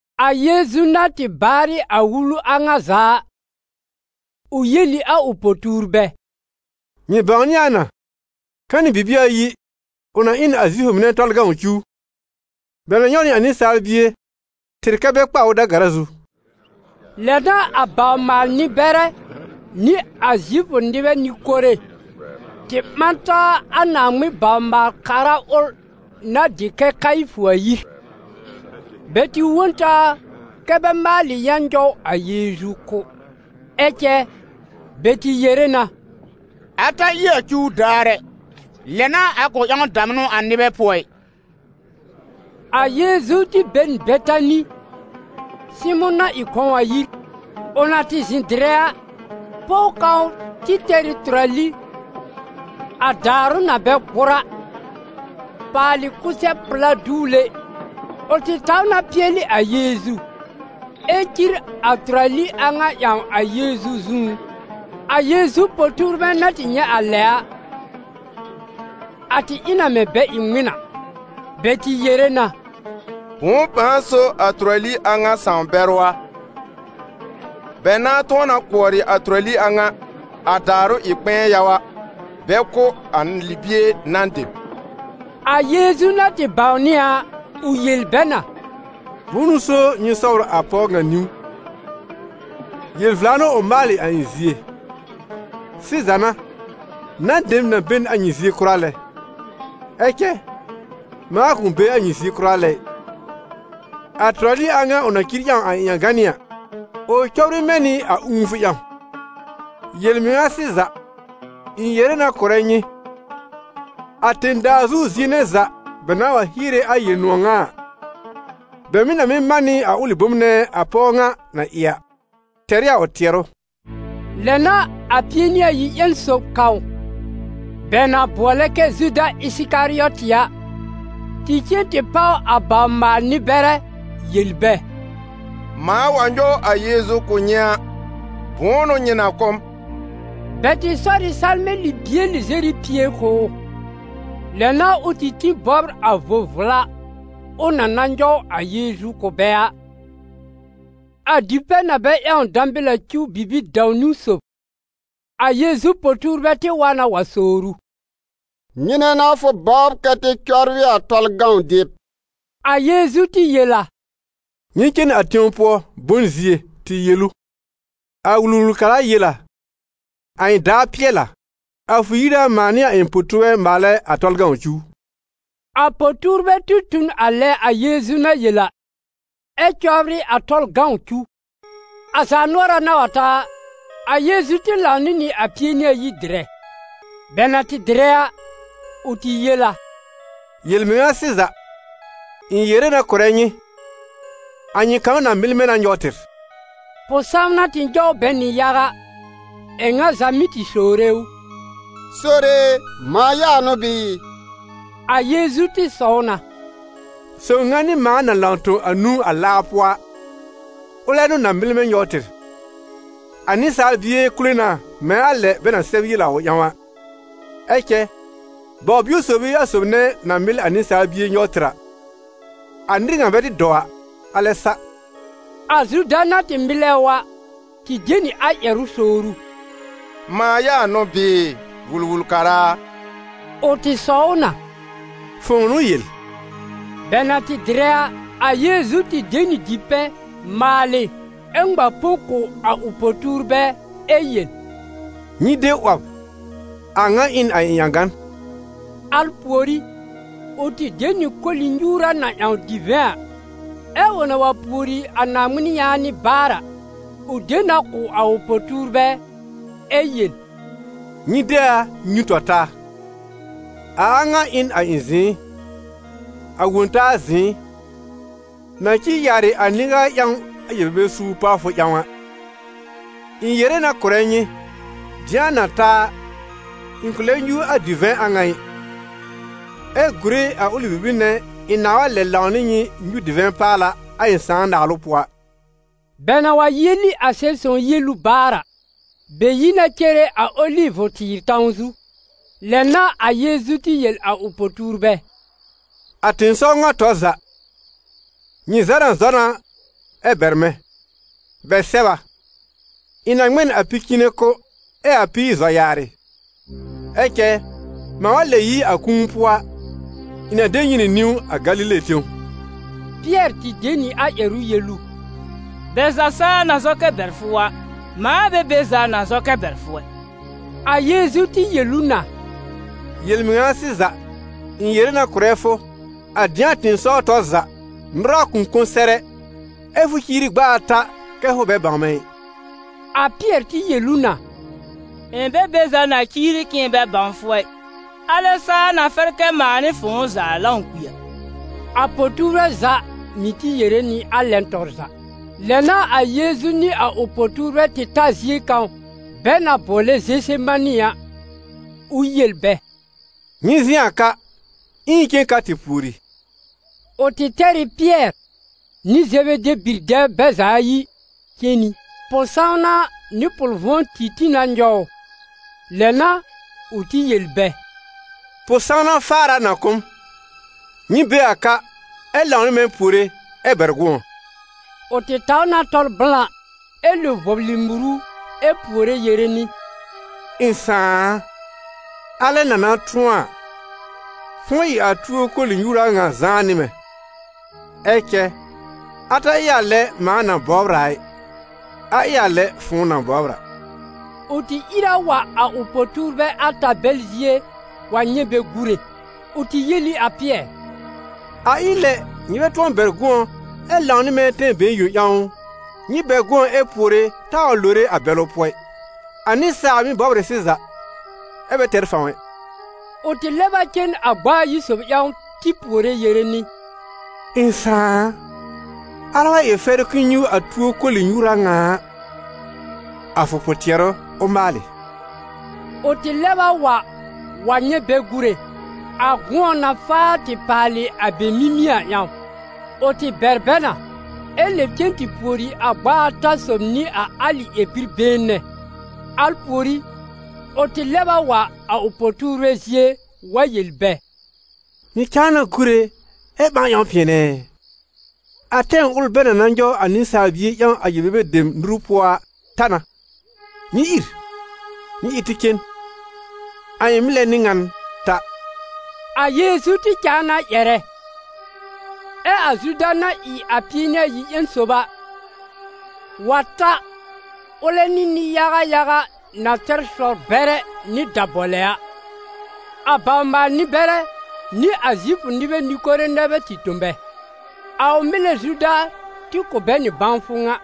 A Yeezu na tɩ baarɩ a wulu a ŋa za a, ʋ yel ɩ a ʋ po-tuurbɛ: «Nyɩ bãwnɩ a na, ka nɩ bibie ayi ʋ na ɩ n a Zifʋ mɩnɛ Tɔlʋ cuw: bɛ na nyɔw nɩ a Nɩsaal Bie tɩr kɛ́ bɛ kpa ʋ da-gara zu.» Lɛ n'a a bawr-maal-nɩ-bɛrɛ, nɩ a Zifʋ nɩbɛ nɩ-kore, tɩ ɓã taa a Naaŋmɩn bawr-maal-kara ʋl na tɩ dɩ kɛ Kayifʋ a yir. Bɛ tɩ wõ n taa kɛ bɛ maalɩ yã nyɔw a Yeezu kʋ́. Ɛ cɛ bɛ tɩ yere na: «A ta ɩ a cuw daar ɛ, lɛ n'a a kʋ̃ ƴãw damnʋ a nɩbɛ pʋɔ ɩ.» A Yeezu tɩ be n Betani, Sɩmʋ̃ na ɩ kɔ̃w a yir. Ʋ na tɩ zɩ̃ dɩrɛ a, pɔw kãw tɩ tɛr ɩ tʋrali, a daarʋ na bɛ gbʋr a, paalɩ kʋsɛ-pla duwle; ʋ tɩ taw na pɩɛlɩ a Yeezu, ɛ cir a tʋrali a ŋa ƴãw a Yeezu zũú. A Yeezu po-tuurbɛ na tɩ nyɛ̃ a lɛ a, a tɩ ɩ na mɛ̃ bɛ ɩ ŋmɩn a. Bɛ tɩ yere na: «Bʋ̃ʋ pãa so a tʋrali a ŋa sãw-bɛrʋ a? Bɛ nãá tʋ̃ɔ na kʋɔrɩ a tʋrali a ŋa, a daarʋ ɩ kpɛ̃ɛ yaga, bɛ kʋ̀ a libie nan dem.» A Yeezu na tɩ bãwnɩ a, ʋ yel bɛ na: «Bʋ̃ʋ n'ʋ so nyɩ sɔbr a pɔw ŋa niwn? Yel-vla n'ʋ ʋ maalɩ a ɩ̃ zie. Sɩza n'a, nan dem na be n a nyɩ zie kʋra lɛ, ɛ cɛ mãa kʋ̃ be a nyɩ zie kʋra lɛ ɩ. A tʋrali a ŋa ʋ na cir ƴãw a ɩ̃ ƴãganɩ́ a, ʋ cɔbr ɩ mɛ̃ nɩ a ũufʋ ƴãw. Yel-mɩŋa sɩza, ɩ̃ yere na kʋ̀rɛ nyɩ: a tẽ-daa zu zie nɛ za bɛ nãà wa hiere a Yel-nʋ̃ɔ̀ ŋa a, bɛ mɩ̀ na mɩ́ man nɩ a ʋlɩ bom nɛ a pɔw ŋa na ɩ a, tɛr ɩ a ʋ tɩɛrʋ.» Lɛ n'a a Pie-nɩ-ayi ƴẽn sob kãw bɛ na bʋɔlɛ kɛ Zuda Ɩsɩkarɩɔtɩ a, tɩ cen tɩ páw a bawr-maal-nɩ-bɛrɛ yel bɛ: «Mãa wa nyɔw a Yeezu kʋ̀ nyɩ a, bʋ̃ʋ n'ʋ nyɩ na kʋ̀ m?» Bɛ tɩ sɔr ɩ salmɛ̃ libie lɩzɛr ɩ pie kʋ̀ ʋ. Lɛ n'a ʋ tɩ tĩ bɔbr a vo-vla ʋ na na nyɔw a Yeezu kʋ̀ bɛ a. A dipɛ̃ na bɛ ƴãw dãbɩl a cuw bibi-dãw-niwn sob, a Yeezu po-tuurbɛ tɩ wa na wa sowr ʋ: «Nyɩnɛ n'a fʋ bɔbr kɛ tɩ cɔbrɩ a Tɔlʋ cuw dɩb?» A Yeezu tɩ yel a: «Nyɩ cen a tẽw pʋɔ, bon zie, tɩ yel ʋ: ‹A Wul-wul-kara yel a: a ɩ̃ daar pɩɛl a, a fʋ yir a mãa nɩ a ɩ̃ po-tuurbɛ maalɛ a Tɔlʋ cuw.›» A po-tuurbɛ tɩ tu n a lɛ a Yeezu na yel a, ɛ cɔbrɩ a Tɔlʋ cuw. A zaanʋɔra na wa ta a, a Yeezu tɩ lãw nɩ nɩ a Pie-nɩ-ayi dɩrɛ. Bɛ na tɩ dɩrɛ a, ʋ tɩ yel a: «Yel-mɩŋa sɩza, ɩ̃ yere na kʋ̀rɛ nyɩ, a nyɩ kãw na mɩl mɛ̃ na nyɔw tɩr.» Pʋ-sãwna tɩ nyɔw bɛ nɩ yaga, ɛ ŋa za mɩ́ tɩ sowre ʋ: «Sore e, mãa ya n'ʋ bɩɩ?» A Yeezu tɩ sɔw na: «Sob ŋa nɩ mãa na lãw tõ a nũu a laa pʋɔ a, ʋlɛ n'ʋ na mɩl mɛ̃ nyɔw tɩr. A Nɩsaal Bie kule na mɛ̃ a lɛ bɛ na sɛb yel a ʋ ƴãw a, ɛ cɛ baw-bio sob ɩ a sob nɛ na mɩl a Nɩsaal bie nyɔw tɩr a, a nɩr ŋa bɛ tɩ dɔw a, alɛ sa.» A Zuda na tɩ mɩlɛ ʋ a, tɩ de nɩ a ƴɛrʋ sowr ʋ: «Mãa ya n'ʋ bɩɩ, Wul-wul-kara a?» Ʋ tɩ sɔw ʋ na: «Fʋ̃ʋ n'ʋ yel.» Bɛ na tɩ dɩrɛ a, a Yeezu tɩ de nɩ dipɛ̃, maalɩ, ɛ ŋma põ kʋ̀ a ʋ po-tuurbɛ ɛ yel: «Nyɩ de 'wɔb, a ŋa ɩ n a ɩ̃ ƴãgan.» Al pùorí, ʋ tɩ de nɩ koli-nyuura na ƴãw divɛ̃ a, ɛ ʋ na wa pùori a Naaŋmɩn yaanɩ baar a, ʋ de na kʋ̀ a ʋ po-tuurbɛ ɛ yel: «Nyɩ de a nyũ tɔ taa, a a ŋa ɩ n a ɩ̃ zɩ̃ɩ, a Wõ-taa zɩ̃ɩ, na cir yaarɩ a nɩ-yaga ƴãw a yel-bebe suur pawfʋ ƴãw a. Ɩ̃ yere na kʋ̀rɛ nyɩ, dɩ̃a na ta a, ɩ̃ kʋ̃ lɛ nyũ a divɛ̃ a ŋa ɩ, ɛ gùre a ʋlɩ bibir nɛ ɩ̃ nãá lɛb wa lãw nɩ nyɩ nyũ divɛ̃ paala a ɩ̃ Sãà naalʋ pʋɔ a.» Bɛ na wa yieli a Sɛb-sõw yielu baar a, bɛ yi na cere a Olivʋ-tɩɩr tãw zu. Lɛ n'a a Yeezu tɩ yel a ʋ po-tuurbɛ: «A tɩ̃ɩsɔw ŋa tɔr za, nyɩ za na zɔ na ɛ bɛr mɛ̃. Bɛ sɛb a: ‹Ɩ̃ na ŋmɛ n a pi-cɩ̃ɩnɛ kʋ́ ɛ a píir zɔ yaarɩ.› Ɛ cɛ mãa wa lɛb yi a kũu pʋɔ a, ɩ̃ na de nyɩ nɩ niwn a Galile tẽw.» Pɩɛr tɩ de nɩ a ƴɛrʋ yel ʋ: «Bɛ za saa na zɔ kɛ bɛr fʋ a, mãa bɛ be za na zɔ kɛ bɛr fʋ ɛ.» A Yeezu tɩ yel ʋ na: «Yel-mɩŋa sɩza, ɩ̃ yere na kʋ̀rɛ fʋ, a dɩ̃a tɩ̃ɩsɔw tɔr za, nʋra kʋ̃ kõ sɛr ɛ, ɛ fʋ ciiri gb'a ata kɛ fʋ bɛ bãw mɛ̃ ɩ.» A Pɩɛr tɩ yel ʋ na: «Ɩ̃ bɛ be za na ciiri k'ɩ̃ɩ bɛ bãw fʋ ɛ, alɛ saa na fɛr kɛ mãa nɩ fʋ̃ʋ za lãw kpi a.» A po-tuurbɛ za mɩ̀ tɩ yere nɩ a lɛn tɔr za. Lɛ n'a a Yeezu nɩ a ʋ po-tuurbɛ tɩ ta zie kãw bɛ na bʋɔlɛ Zesemani a, ʋ yel bɛ: «Nyɩ zɩ̃ a ka, ɛ ɩ̃ cen ka tɩ pùori.» Ʋ tɩ tɛr ɩ Pɩɛr nɩ Zebede bi-dɛbr bɛ za ayi cen nɩ. Pʋ-sãwna nɩ pʋl-vʋ̃ɔ tɩ tĩ na nyɔw ʋ. Lɛ n'a ʋ tɩ yel bɛ: «Pʋ-sãwna faar a na kʋ́ m, nyɩ be a ka, ɛ lãw nɩ mɛ̃ puore ɛ bɛr gʋ̃ɔ.» Ʋ tɩ taw na tɔl blã ɛ lo vɔblɩ muru ɛ puore yere nɩ: «Ɩ̃ Sãà a, alɛ na na tʋ̃ɔ a, fʋ̃ʋ ɩ a tuo koli-nyuura ŋa zãá nɩ mɛ̃! Ɛ cɛ a ta ɩ a lɛ mãa na bɔbr a ɩ, a ɩ a lɛ fʋ̃ʋ na bɔbr a.» Ʋ tɩ ìr a wa a ʋ po-tuurbɛ ata bɛl zie wa nyɛ̃ bɛ gùre. Ʋ tɩ yel ɩ a Pɩɛr: «A ɩ lɛ nyɩ bɛ tʋ̃ɔ bɛr gʋ̃ɔ ɛ lãw nɩ mɛ̃ tɛm been yõ ƴãw ʋ? Nyɩ bɛr gʋ̃ɔ ɛ puore taa wa lore a bɛlʋ pʋɔ ɩ. A nɩsaal mɩ́ bɔbr ɩ sɩza, ɛ bɛ tɛr fãw ɛ.» Ʋ tɩ lɛb a cen a gb'a ayi sob ƴãw tɩ puore yere nɩ: «Ɩ̃ Sãà a, alɛ wa ɩ fɛrʋ k'ɩ̃ɩ nyũ a tuo koli-nyuura ŋa a, a fʋ pʋ-tɩɛrʋ ʋ maalɩ.» Ʋ tɩ lɛb a wa wa nyɛ̃ bɛ gùre, a gʋ̃ɔ na faa tɩ paalɩ a bɛ mimie a ƴãw. Ʋ tɩ bɛr bɛ na ɛ lɛb cen tɩ pùori a gb'a ata sob nɩ a alɩ ƴɛr-bi-been nɛ. Al pùorí, ʋ tɩ lɛb a wa a ʋ po-tuurbɛ zie wa yel bɛ: «Nyɩ cãa na gùre, ɛ ɓãa ƴãw pɩɛnɛ ɛ? A tɛm ʋl bɛ na na nyɔw a Nɩsaal Bie ƴãw a yel-bebe dem nuru pʋɔ a ta na. Nyɩ ìr! Nyɩ ɩ tɩ cen! A ɩ̃ mɩlɛ n'ɩ ŋan ta.» A Yeezu tɩ cãa na ƴɛrɛ, ɛ a Zuda na ɩ a Pie-nɩ-ayi ƴẽn sob a, wa ta ʋlɛ nɩ nɩ-yaga yaga na tɛr sɔ-bɛrɛ nɩ dabɔlɛ a. A bawr-maal-nɩ-bɛrɛ nɩ a Zifʋ nɩbɛ nɩ-kore nɛ bɛ tɩ tõ bɛ. A ʋ mɩlɛ Zuda tɩ kʋ̀ bɛ nɩ bãwfʋ ŋa: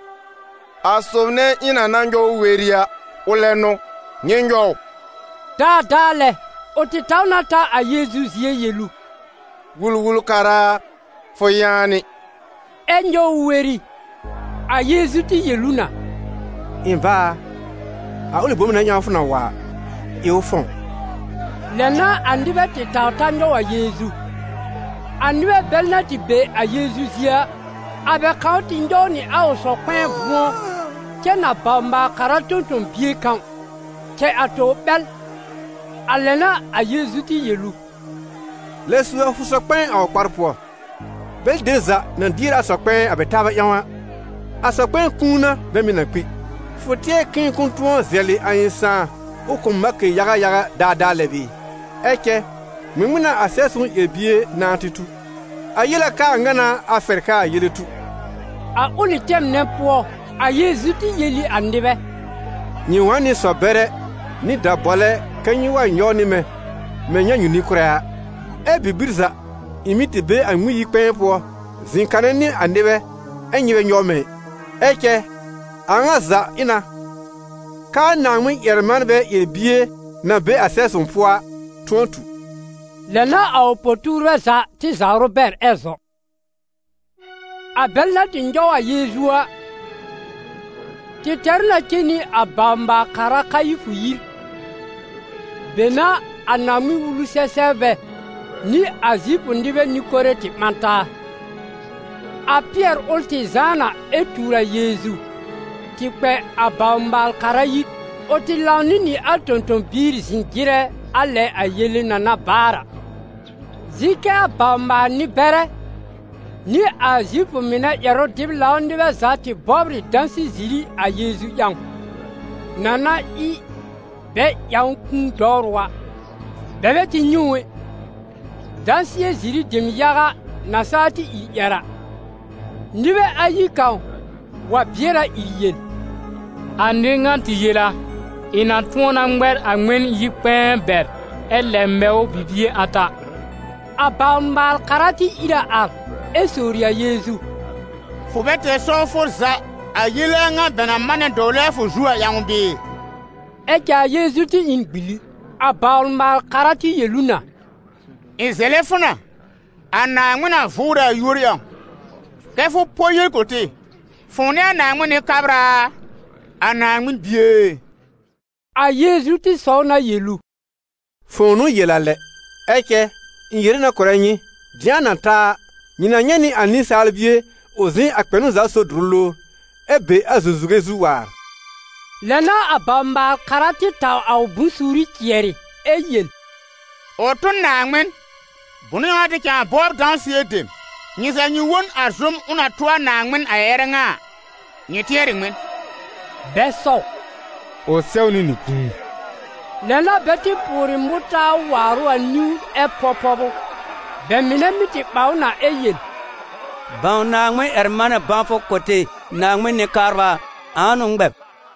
«A sob nɛ ɩ̃ na na nyɔw weri a, ʋlɛ n'ʋ, nyɩ nyɔw ʋ.» Daadaa lɛ, ʋ tɩ taw na ta a Yeezu zie yel ʋ: «Wul-wul-kara a, fʋ yaanɩ!» Ɛ nyɔw ʋ weri. A Yeezu tɩ yel ʋ na: «Ɩ̃ bá a, a ʋlɩ bom nɛ ƴãw fʋ na wa a, ɩ ʋ fɔ̃w.» Lɛ n'a a nɩbɛ tɩ taw ta nyɔw a Yeezu. A nɩbɛ bɛl na tɩ be a Yeezu zie a, a bɛ kãw tɩ nyɔw nɩ a ʋ sɔ-kpɛ̃ɛ vʋ̃ɔ cɛ n a bawr-maal-kara tõ-tõ-bie kãw, cɛ a tobr ɓɛl. A lɛ n'a a Yeezu tɩ yel ʋ: «Lɛb su a fʋ sɔ-kpɛ̃ɛ a ʋ kpar pʋɔ, bɛlɩ dem za na dier a sɔ-kpɛ̃ɛ a bɛ taabɛ ƴãw a, a sɔ-kpɛ̃ɛ kũu n'a bɛ mɩ̀ na kpi. Fʋ tɩɛr k'ɩ̃ɩ kʋ̃ʋ tʋ̃ɔ zɛlɩ a ɩ̃ Sãà ʋ kʋ̀ m malkɩ yaga yaga daadaa lɛ bɩɩ? Ɛ cɛ ŋmɩŋmɩn n'a a Sɛb-sõw ƴɛr-bie nãá tɩ tu? A yel a k'aa ŋa n'a a fɛr k'aa yele tu.» A ʋlɩ tɛm nɛ pʋɔ, a Yeezu tɩ yel ɩ a nɩbɛ: «Nyɩ wa n nɩ sɔ-bɛrɛ nɩ dabɔlɛ kɛ nyɩ wa nyɔw nɩ mɛ̃, mɛ̃ nyãnyu-nɩ-kʋ́rɛ a, ɛ bibir za ɩ̃ mɩ́ tɩ be a Ŋmɩn-yi-kpɛ̃ɛ pʋɔ zɩ̃ kanɛ nɩ a nɩbɛ ɛ nyɩ bɛ nyɔw mɛ̃ ɩ. Ɛ cɛ a a ŋa za ɩ na, k'aa Naaŋmɩn-ƴɛr-manbɛ ƴɛr-bie na be a Sɛb-sõw pʋɔ a, tʋ̃ɔ tu.» Lɛ n'a a ʋ po-tuurbɛ za tɩ zawr ʋ bɛr ɛ zɔ. A bɛl na tɩ nyɔw a Yeezu a, tɩ tɛr ʋ na cen nɩ a bawr-maal-kara Kayifʋ yir; be n'a a Naaŋmɩn-Wulu-sɛ-sɛbrbɛ nɩ a Zifʋ nɩbɛ nɩ-kore tɩ ɓã taa. A Pɩɛr ʋl tɩ zãá na ɛ tuur a Yeezu, tɩ kpɛ a bawr-maal-kara yir; ʋ tɩ lãw nɩ nɩ a tõ-tõ-biir zɩ̃ jɩrɛ a lɛ a yele na na baar a. Zɩ̃ kɛ a bawr-maal-nɩ-bɛrɛ nɩ a Zifʋ mɩnɛ ƴɛrʋ-dɩb-lãw nɩbɛ za tɩ bɔbr ɩ dãsɩɛ-ziri a Yeezu ƴãw, na na ɩ bɛ ƴãw ʋ kũu dɔwrʋ a. Bɛ bɛ tɩ nyɛ̃ ʋ ɛ, dãsɩɛ-ziri dem yaga na saa tɩ ìr ƴɛr a. Nɩbɛ ayi kãw wa bɩɛr a ìr yel: «A nɩr ŋa tɩ yel a: ‹Ɩ̃ na tʋ̃ɔ na ŋmɛr a Ŋmɩn-yi-kpɛ̃ɛ bɛr ɛ lɛb mɛ ʋ bibie ata.›» A bawr-maal-kara tɩ ìr a ar ɛ sowri a Yeezu: «Fʋ bɛ tɛr sɔwfʋ za a yele a ŋa bɛ na manɛ dɔwlɛ a fʋ zu a ƴãw bɩɩ?» Ɛ cɛ a Yeezu tɩ ɩ n gbili. A bawr-maal-kara tɩ yel ʋ na: «Ɩ̃ zɛlɛ fʋ na, a Naaŋmɩn na vʋʋrɛ a yúor ƴãw, kɛ fʋ pɔ yel kʋ̀ tɩ: fʋ̃ʋ n'ɩ a Naaŋmɩn Nɩ-kabra a, a Naaŋmɩn Bie e?» A Yeezu tɩ sɔw na yel ʋ: «Fʋ̃ʋ n'ʋ yel a lɛ. Ɛ cɛ ɩ̃ yere na kʋ̀rɛ nyɩ, dɩ̃a na ta a, nyɩ na nyɛ̃ nɩ a Nɩsaal Bie ʋ zɩ̃ a Kpɛnʋ-za-sob dʋrʋ lowr, ɛ be a zũzuge zu waar.» Lɛ n'a a bawr-maal-kara tɩ taw a ʋ bʋ̃-suuri cɩɛrɩ, ɛ yel: «Ʋ tʋ n Naaŋmɩn! Bʋnʋ ƴãw n'a tɩ cãa bɔbr dãsɩɛ dem? Nyɩ za nyɩ wõ n a zʋ́m ʋ na tʋ a Naaŋmɩn a ƴɛrɛ ŋa a. Nyɩ tɩɛr ɩ ŋmɩn?» Bɛ sɔw: «Ʋ sɛwnɩ nɩ kũu.» Lɛ n'a bɛ tɩ pʋʋrɩ mʋtaar waar ʋ a niwn ɛ pɔb pɔb ʋ; bɛ mɩnɛ mɩ́ tɩ ɓa ʋ na ɛ yel: «Bãw Naaŋmɩn-ƴɛr-manɛ bãwfʋ kʋ̀ tɩ, Naaŋmɩn Nɩ-kabra a, ãa n'ʋ ŋmɛ b?»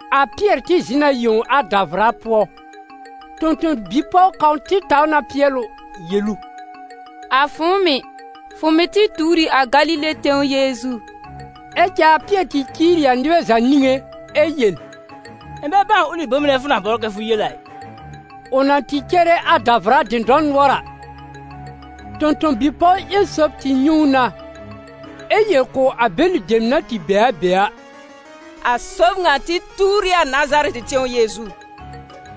A Pɩɛr tɩ zɩ̃ n a yẽw a davʋra pʋɔ. Tõ-tõ-bi-pɔw kãw tɩ taw na pɩɛl ʋ yel ʋ: «A fʋ̃ʋ mɩ̀, fʋ mɩ̀ tɩ tuur ɩ a Galile tẽw Yeezu.» Ɛ cɛ a Pɩɛr tɩ ciir ɩ a nɩbɛ za niŋé, ɛ yel: «Ɩ̃ bɛ bãw ʋlɩ bom nɛ fʋ na bɔbr kɛ fʋ yel a ɩ.» Ʋ na tɩ cere a davʋra dɩ̃dɔr nʋɔr a, tõ-tõ-bi-pɔw ƴẽn sob tɩ nyɛ̃ ʋ na, ɛ yel kʋ̀ a bɛlɩ dem na tɩ be a be a: «A sob ŋa tɩ tuur ɩ a Nazarɛtɩ tẽw Yeezu.»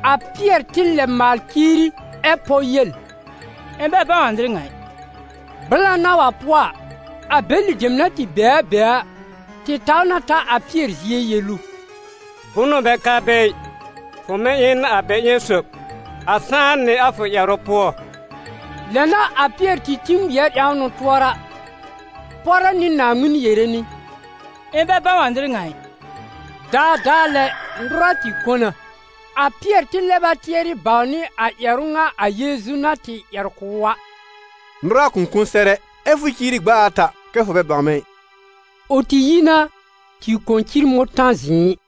A Pɩɛr tɩ lɛb maal ciiri, ɛ pɔ yel: «Ɩ̃ bɛ bãw a nɩr ŋa ɩ!» Blã na wa pʋɔ a, a bɛlɩ dem na tɩ be a be a, tɩ taw na ta a Pɩɛr zie yel ʋ: «Bʋnʋ bɛ ka be ɩ, fʋ mɩ̀ ɩ n a bɛ ƴẽn sob, a sãá nɩ a fʋ ƴɛrʋ pʋɔ.» Lɛ n'a a Pɩɛr tɩ tĩ ŋmɩɛr ƴãwn ʋ tʋɔra, pɔrɛ nɩ Naaŋmɩn yere nɩ: «Ɩ̃ bɛ bãw a nɩr ŋa ɩ!» Daadaa lɛ nʋra tɩ kõ na. A Pɩɛr tɩ lɛb a tɩɛrɩ bãwnɩ a ƴɛrʋ ŋa a Yeezu na tɩ ƴɛr kʋ̀ ʋ a: «Nʋra kʋ̃ kõ sɛr ɛ, ɛ fʋ ciiri gb'a ata kɛ fʋ bɛ bãw mɛ̃ ɩ.» Ʋ tɩ yi na tɩ kõ cir mʋ̃tã-zɩ̃ɩ.